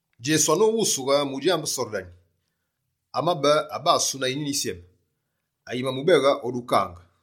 Djesu anoghusughe mudjambe Sordani, amabe abasu na Yinyuni Yisyeme, ayimamubeghe o dukange.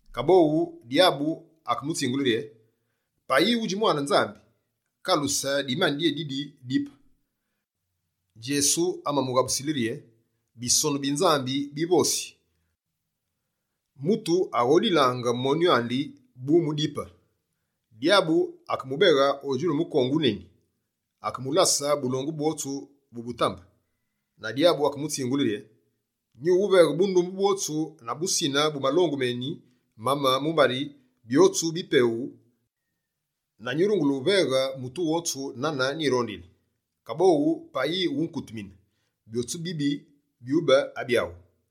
Kaboghu, Dyabu akemutsingule rye: «Payi wudji Mwane Nzambi, kaluse dimani dyédidi dipe.» Djesu amamuwaghule: «Bisonu bi Nzambi bivosi rye: “Mutu aghodilaange monyu andi, bu mu dipe.”» Dyabu, akemubeghe o djulu mukongu wuneni. Akemulase bulongu bwotsu bu butambe. Na dyabu akemutsingule rye: «Nyuwuveghe bundumbe bwotsu na busine bu malongu méni mame mumbari byotsu bipeghu na nyurungule wuveghe mutu wotsu nane nyirondili. Kaboghu, payi wukutumine, byotsu bibi byube abyawu.»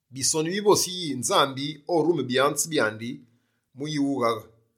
Bisonu bivose yi: “Nzambi orume byanze byandi mu wughaghaange.”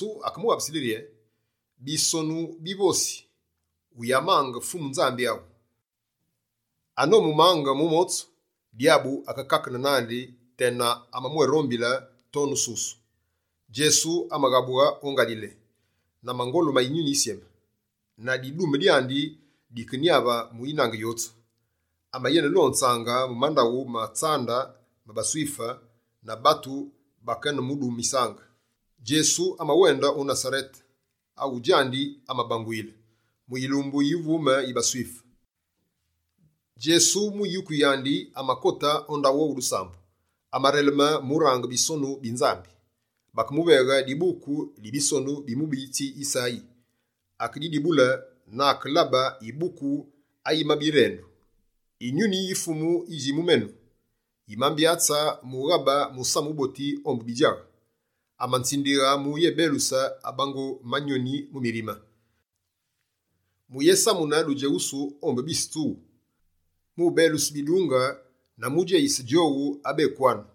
Djesu akemughabusile rye: «Bisonu bivosi: “Wuyamange Fumu Nzambi awu.”» Anomumange mu motsu, Dyabu akekakene nandi tena amamwérombile tonu susu. Djesu amaghabughe o Ngalile, na mangolu ma Yinyuni Yisyeme. Na didume dyandi dikenyave mu yinange yotsu. Amenelonzaange mu mandaghu ma tsambu ma baSwife na batu bakenemudumisaange. Djesu amawende o Nasarete awu djandi amabanguyile. Mu yilumbu yi uvume yi baSwife, Djesu, mu yuku yandi amakote o ndaghu owu dusambu. Amareleme mu range Bisonu bi Nzambi. Bakemuveghe dibuku di bisonu bi mubiyitsi Yisayi. Akedidibule na akelabe yibuku ayimabe yirendu: «Yinyuni yi Fumu yidji mu menu, yimambyatse mu ghabe musamu wuboti ombu bidjaghe. Amanzindighe muyebeluse abango manyoni mu mirime, mu yesamune dudjeghusu ombu bise tsughu, mu beluse bidunge na mu djeyise djowu abekwanu.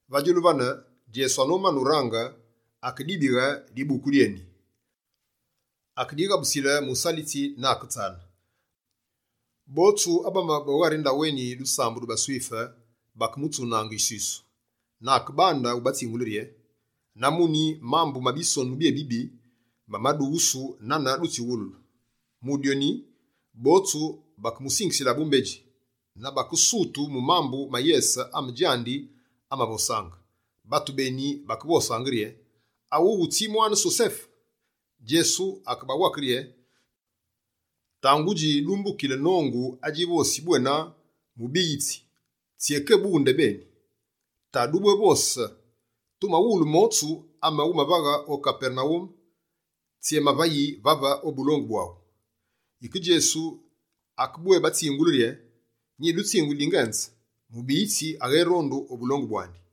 Va djulu vane, Djesu anomane urange, akedibighe dibuku dyéni, akedighabusile musalitsi na aketsane. Botsu abamabe o ghari ndaghu éni dusambu dji baSwife bakemutsunaange yiswisu. Na akebande wubatsingule rye: «Na muni, mambu ma Bisonu byébibi mamadughusu nane dutsiwululu.» Mu dyoni, botsu bakemusingisile bumbedji na bakesutu mu mambu ma yese ame djandi amavosaange. Batu béni, bakevosaange rye: «Awuwu tsi mwane Sosefe?» Djesu akebawake rye: «Tangudji dumbukile nongu adjivosi bwena, “Mubuyitsi, tsyékebughe ndebeni.” Ta dubwévose: “Tumawulu motsu ame wumavaghe o Kapernawume, tsyémavayi vave o bulongu bwawu.”» Yike Djesu akebwébatsingule rye: «Nyidutsinguli dingenze, mubiyitsi aghérondu o bulongu bwandi.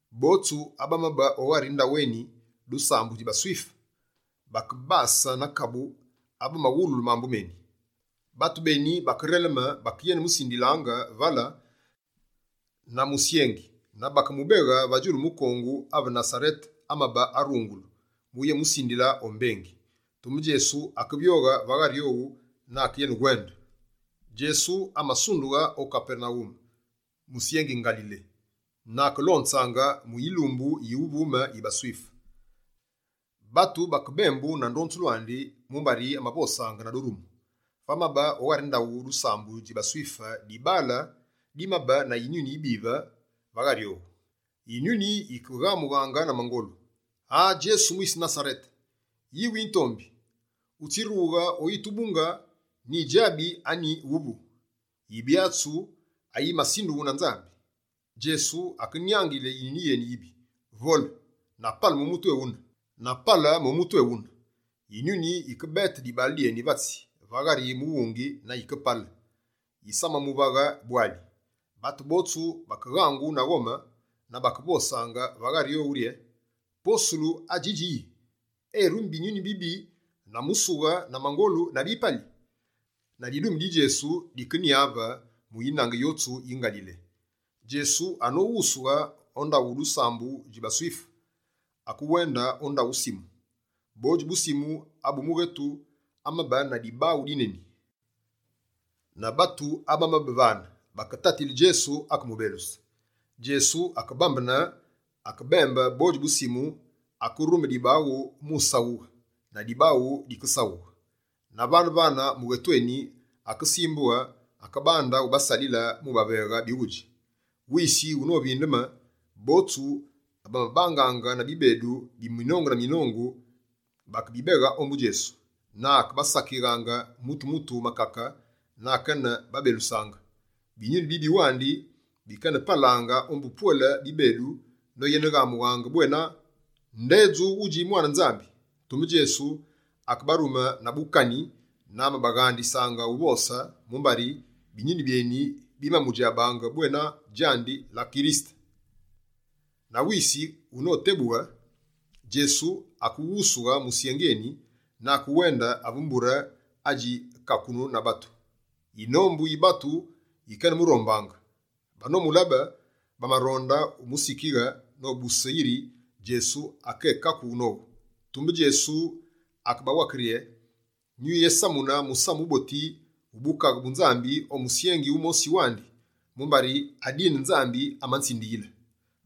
Botsu abamabe o ghari ndaghu éni dusambu dji baSwife bakebase na kabu ave bamawululu mambu méni. Batu béni bakereleme bakenemusindilaange vale na musyengi na bakemubeghe va djulu mukongu ave Nasarete amabe arungulu, muyémusindile o mbengi. Tumbe Djesu akevyoghe va ghari owu na akenewende. Djesu amasundughe o Kapernawume musyengi Ngalile, na akelonzaange mu yilumbu yi uvume yi baSwife. Batu bakebembu na ndonzulu andi, mumbari amavosaange na durumu. Vamabe o ghari ndaghu dusambu dji baSwife dibaale dimabe na yinyuni yibive va ghari owu. Yinyuni yikeghamughe na mangolu: «Aa! Djesu mwisi Nasarete, yi witurombi, utsirughe oyitubunge nyidjabi anyi wuvu, Yibyatsu ayimasindughu na Nzambi!» Djesu akenyangile yinyuni yéni yibi: «Vole na pale mu mutu éwune!» Yinyuni yike bete dibaale dyéni vatsi va ghari mughungi na yikepale, yisamamuvaghe bwali. Batu botsu bakeghangu na ghome na bakevosaange va ghari owu rye: «Posulu adjidji yi! Erumi binyuni bibi na musughe na mangolu na bipali?» Na didume di Djesu dikenyave mu yinange yotsu yi Ngalile. Djesu anoghusughe o ndaghu dusambu dji baSwife, akewende o ndaghu Simu. Bodji bu Simu abu mughetu amabe na dibaghu dineni, na batu abamabe vane, baketatile Djesu akemubeluse. Djesu akebandeme akebembe bodji bu Simu, akerume dibaghu mu saghughe, na dibaghu dikesaghughe. Na vane-vane mughetu éni akesimbughe akebande ubasalile mu baveghe bighudji. Wisi unovindeme, botsu abamabangaange na bibedu bi minongu na minongu bakebabeghe ombu Djesu, na akebasakighaange mutu-mutu makake na akene babelusaange. Binyuni bibi wandi bikenepalaange ombu pwele bibedu noyeneghamughe bwena: «Ndedju wudji mwane Nzambi!» Tumbe Djesu akebarume na bukani na amabaghandisaange uvose, mumbari binyuni byéni bimamudjabaange bwena djandi la Kirisete. Na wisi witebuyi, Djesu akewusughe musyengi éni na akewende ave mbure adji kakunu na batu. Yinombu yi batu yikenemurombaange, banomulabe, bamaronde umusikighe nobuse yiri Djesu akékakughe nowu. Tumbe Djesu akebawake rye: «Nyuyésamune Musamu Wuboti wu bukaghe bu Nzambi o misyengi mimosi wandi, mumbari adine, Nzambi amanzindiyile.»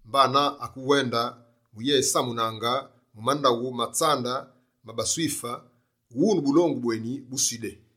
Mbana, akewenda mu yenesamunaange mu mandaghu ma tsambu ma baSwife wune bulongu bweni bu Sudé.